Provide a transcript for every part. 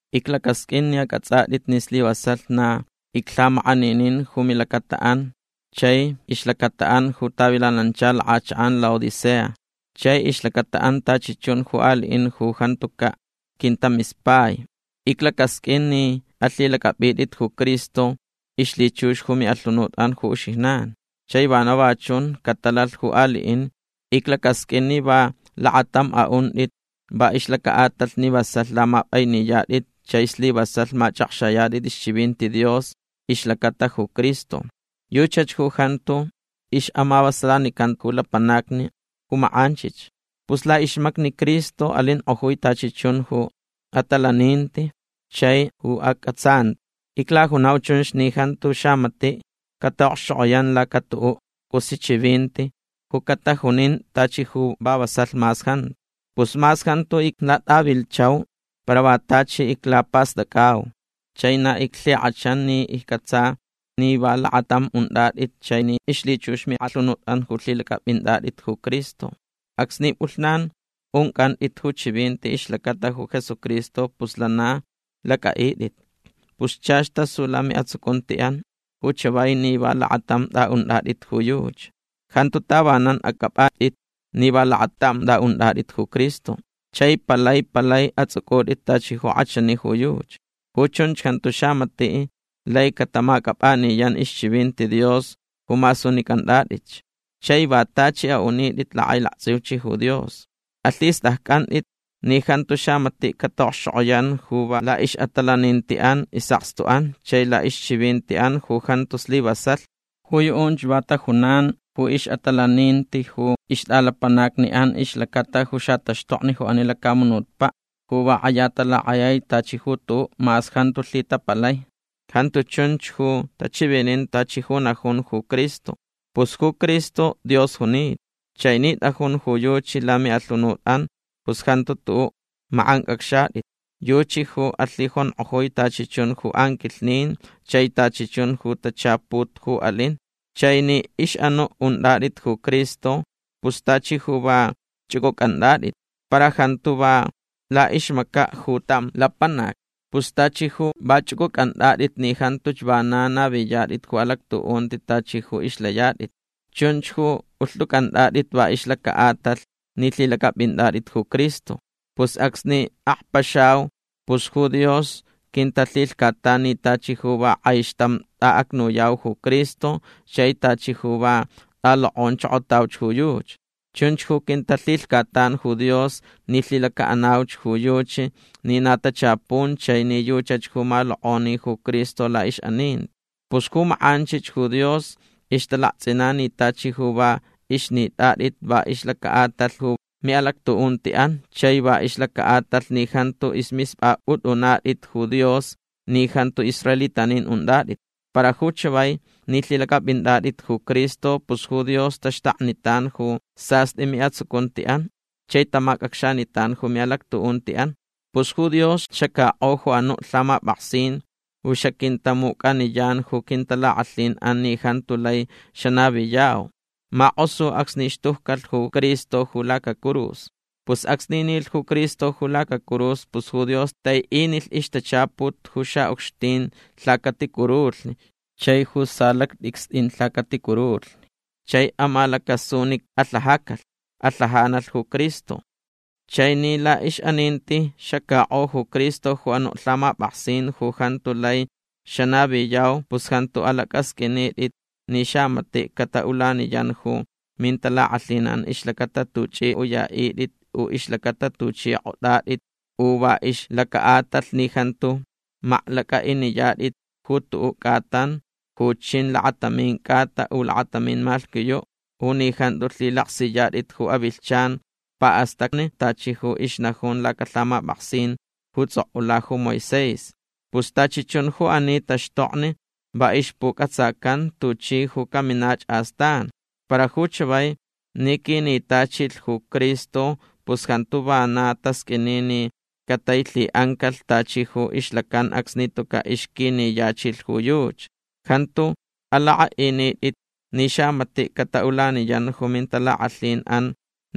Iclacasqʼuin ni acʼatsʼatʼit ni slivasalh na iclhamakʼaninin ju milacataʼan chai ixlacataʼan ju tavilanancha lakʼachakʼan Laodicea chai ixlacataʼan tachi chun ju aliʼin ju jantucaʼ quintamispai. Iclacasqʼuin ni alhilacʼapʼitʼit ju Cristo ixlhichux ju miʼalhunutʼan ju uxijnan. Chai vana va chun catalalh ju aliʼin. Iclacasqʼuin ni va lakatamch aʼuntʼit va ixlacaʼatalh ni vasalh lamapʼainiyatʼit chai slivasalh machʼakxayatʼit ixchivinti Dios ixlacata ju Cristo. Yuchach ju jantu ixʼamavasalanican ju lapanacni ju makʼanchich. Pus laʼixmacni Cristo alinkʼojui tachi chun ju atalaninti chai ju acʼatsanti. Iclajunau chunch ni jantu xamatiʼ cataʼokxchokʼoyan laca tuʼuʼ cʼusi chivinti ju catajunin tachi ju va vasalh mas jantu. Pus mas jantu iclatʼavilhchau para va tachi iclapastʼacʼau. Chai na iclhikʼachanch ni iccʼatsa ni va lakatamch untʼatʼit chai ni ixlhichux miʼalhunutʼan ju lhilacʼapʼintʼatʼit ju Cristo. Acsni pʼulhnan uncʼantʼit ju chivinti ixlacata ju Jesucristo pus lana lacʼaʼitʼit. Pus chach tasu lamiʼatsucuntiʼan ju chavai ni va lakatam tʼaʼuntʼatʼit ju yuchi. Jantu tavanan acʼaptʼit ni va lakatam tʼaʼuntʼatʼit ju Cristo. Chai palai palai atsʼucʼutʼit tachi ju kʼachani ju yuchi. Ju chunch jantu xamatiʼ lai catamacʼapʼaniyan ixchivinti Dios ju masunicʼantʼatʼitch. Chai va tachi aʼunitʼit lakʼailaktsʼiuch ju Dios. Alhistʼaccʼantʼit ni jantu xamatiʼ cataʼokxchokʼoyan ju va laʼixʼatalanintiʼan isʼakstuʼan chai laʼixchivintiʼan ju jantu slivasalh. Ju yuʼunch va tajunan ju ixʼatalaninti ju ixtʼalapanacniʼan ixlacata ju xataxtokni ju ani lacamunutpaʼ ju va kʼaya talakʼayai tachi ju tuʼuʼ mas jantu lhitapalai. Jantu chunch ju tachivinin tachi ju ixnajun ju Cristo. Pus ju Cristo Dios junita. Chai ni tʼajun ju yuchi lamiʼalhunutʼan pus jantu tuʼuʼ makʼancʼacxatʼit. Yuchi ju alhijonkʼojui tachi chun ju anquilhnin chai tachi chun ju tachaput ju alin. Chai ni ixʼanuʼ untʼatʼit ju Cristo pus tachi ju va chʼucʼucʼantʼatʼit. Para jantu va laʼixmacaʼ ju tam lapanac. Pus tachi ju va chʼucʼucʼantʼatʼit ni jantuch vana naviyatʼit ju alactuʼunti tachi ju ixlayatʼit. Chunch ju ulhtʼucʼantʼatʼit va ixlacaʼatalh ni lhilacʼapʼintʼatʼit ju Cristo. Pus acsni akpaxau pus ju Dios quintalhilhcatan ni tachi ju va kʼaixtam tʼaʼacnuyau ju Cristo chai tachi ju va tʼalokʼonchokotauch ju yuchi. Chunch ju quintalhilhcatan ju Dios ni lhilacaʼanauch ju yuchi ni na tachapun chai ni yuchach ju malokʼoni ju Cristo laʼixʼaninti. Pus ju makʼanchich ju Dios ixtalaktsʼinan ni tachi ju va ixnitʼatʼit va ixlacaʼatalh ju miʼalactuʼuntiʼan chai va ixlacaʼatalh ni jantu ismispʼapʼutʼunatʼit ju Dios ni jantu israelitanin untʼatʼit. Para ju chavai ni lhilacʼapʼintʼatʼit ju Cristo pus ju Dios taxtaknitan ju sastʼi miʼatsucuntiʼan chai tamacʼacxanitan ju miʼalactuʼuntiʼan. Pus ju Dios xacakʼo ju anuʼ lhamapʼaksin ju xaquintamucʼaniyan ju quintalakʼalhinʼan ni jantu lai xanaviyau. Makʼosu acsni xtujcalh ju Cristo ju lacacurus. Pus acsni nilh ju Cristo ju lacacurus pus ju Dios taiʼinilh ixtachaput ju xaʼucxtin lhacaticurulhni chai ju salactʼicstʼin lhacaticurulhni. Chai amalacasu ni alhajacalh. Alhajanalh ju Cristo. Chai ni laʼixʼaninti xacakʼo ju Cristo ju anuʼ lhamapʼaksin ju jantu lai xanaviyau pus jantu alacʼasqʼuinitʼit ni xamatiʼ cataʼulaniyan ju mintalakʼalhinʼan ixlacata tuchʼi uyatʼit u ixlacata tuchʼi kʼotʼatʼit u va ixlacaʼatalh ni jantu maklacʼaʼiniyatʼit ju tuʼuʼ cʼatan ju chin lakatamin cʼata u lakatamin malhquiyuʼ u ni jantu lhilaksiyatʼit ju avilhchan paʼastacni tachi ju ixnajun lacalhamapʼaksin ju tsʼokʼula ju Moisés. Pus tachi chun ju ani taxtokni va ixpucʼatsacan tuchi ju caminach astan. Para ju chavai ni quinitachilh ju Cristo pus jantu va na tasqʼuini ni catailhiʼancalh tachi ju ixlacan acsni tucaʼ ixquiniyachilh ju yuchi. Jantu alakʼaʼinitʼit ni xamatiʼ cataʼulaniyan ju mintalakʼalhinʼan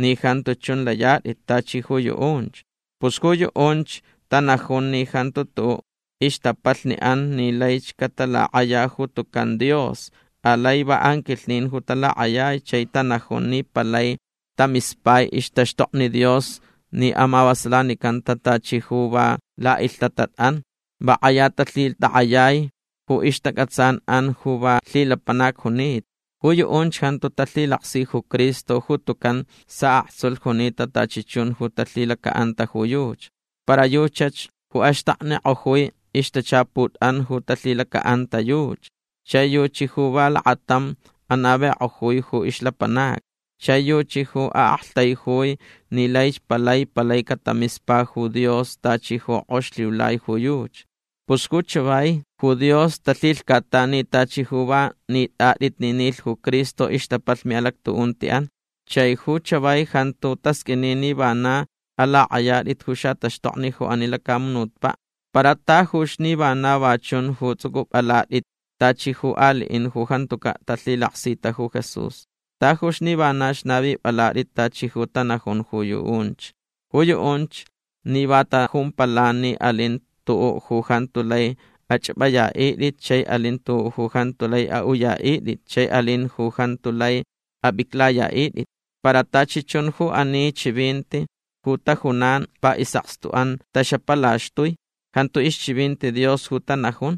ni jantu chun layatʼit tachi ju yuʼunch. Pus ju yuʼunch tanajun ni jantu tuʼuʼ ixtapalhniʼan ni laich catalakʼaya ju tucan Dios. Alai va anquilhnin ju talakʼayai. Chai tanajun ni palai tamispai ixtaxtokni Dios ni amavasalanicanta tachi ju va laʼilhtatatʼan. Va kʼaya talhitakʼayai ju ixtacʼatsanʼan ju va lhilapanac junita. Ju yuʼunch jantu talhilaksi ju Cristo ju tucan saʼaktsulh junita tachi chun ju talhilacaʼanta ju yuchi. Para yuchach ju axtaknikʼojui ixtachaputʼan ju talhilacaʼanta yuchi. Chai yuchi ju va lakatam anavikʼojui ju ixlapanacni. Chai yuchi ju aʼaktaijui ni laich palai palai catamispa ju Dios tachi ju kʼox lhiulai ju yuchi. Pus ju chavai ju Dios talhilhcatan ni tachi ju va nitʼatʼit ni nilh ju Cristo ixtapalh miʼalactuʼuntiʼan. Chai ju chavai jantu tasqʼuini ni vana alakʼayatʼit ju xataxtokni ju ani lacamunutpaʼ. Para tajuch ni vana va chun ju tsʼucʼupʼalatʼit tachi ju aliʼin ju jantucaʼ talhilaksita ju Jesús. Tajuch ni vanach navipʼalatʼit tachi ju tanajun ju yuʼunch. Ju yuʼunch ni va tajumpalan ni alin tuʼuʼ ju jantu lai achʼapʼayaʼitʼit chai alin tuʼuʼ ju jantu lai aʼuyaʼitʼit chai alin ju jantu lai apʼiclayaʼitʼit. Para tachi chun ju ani chivinti ju tajunan va isʼakstuʼan taxapalaxtui. Jantu ixchivinti Dios ju tanajun.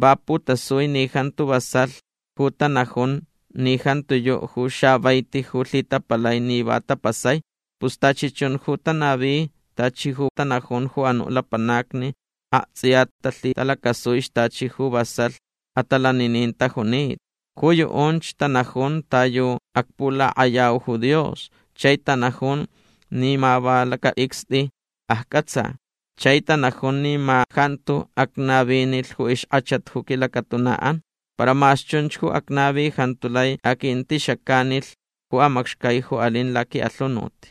Va putasui ni jantu vasalh ju tanajun ni jantiyuʼ ju xavaiti ju lhitapalai ni va tapasai. Pus tachi chun ju tanavi tachi ju tanajun ju anuʼ lapanacni aktsʼiya talhitalacasuich tachi ju vasalh atalaninin tajunita. Ju yuʼunch tanajunch ta yu acpulakʼayau ju Dios. Chai tanajun ni ma va lacatʼicstʼi accʼatsa. Chai tanajun ni ma jantu acnavinilh ju ixkʼachat ju quilacatunaʼan. Para mas chunch ju acnavi jantu lai aquintixacanilh ju amacxcai ju alin laquiʼalhunut.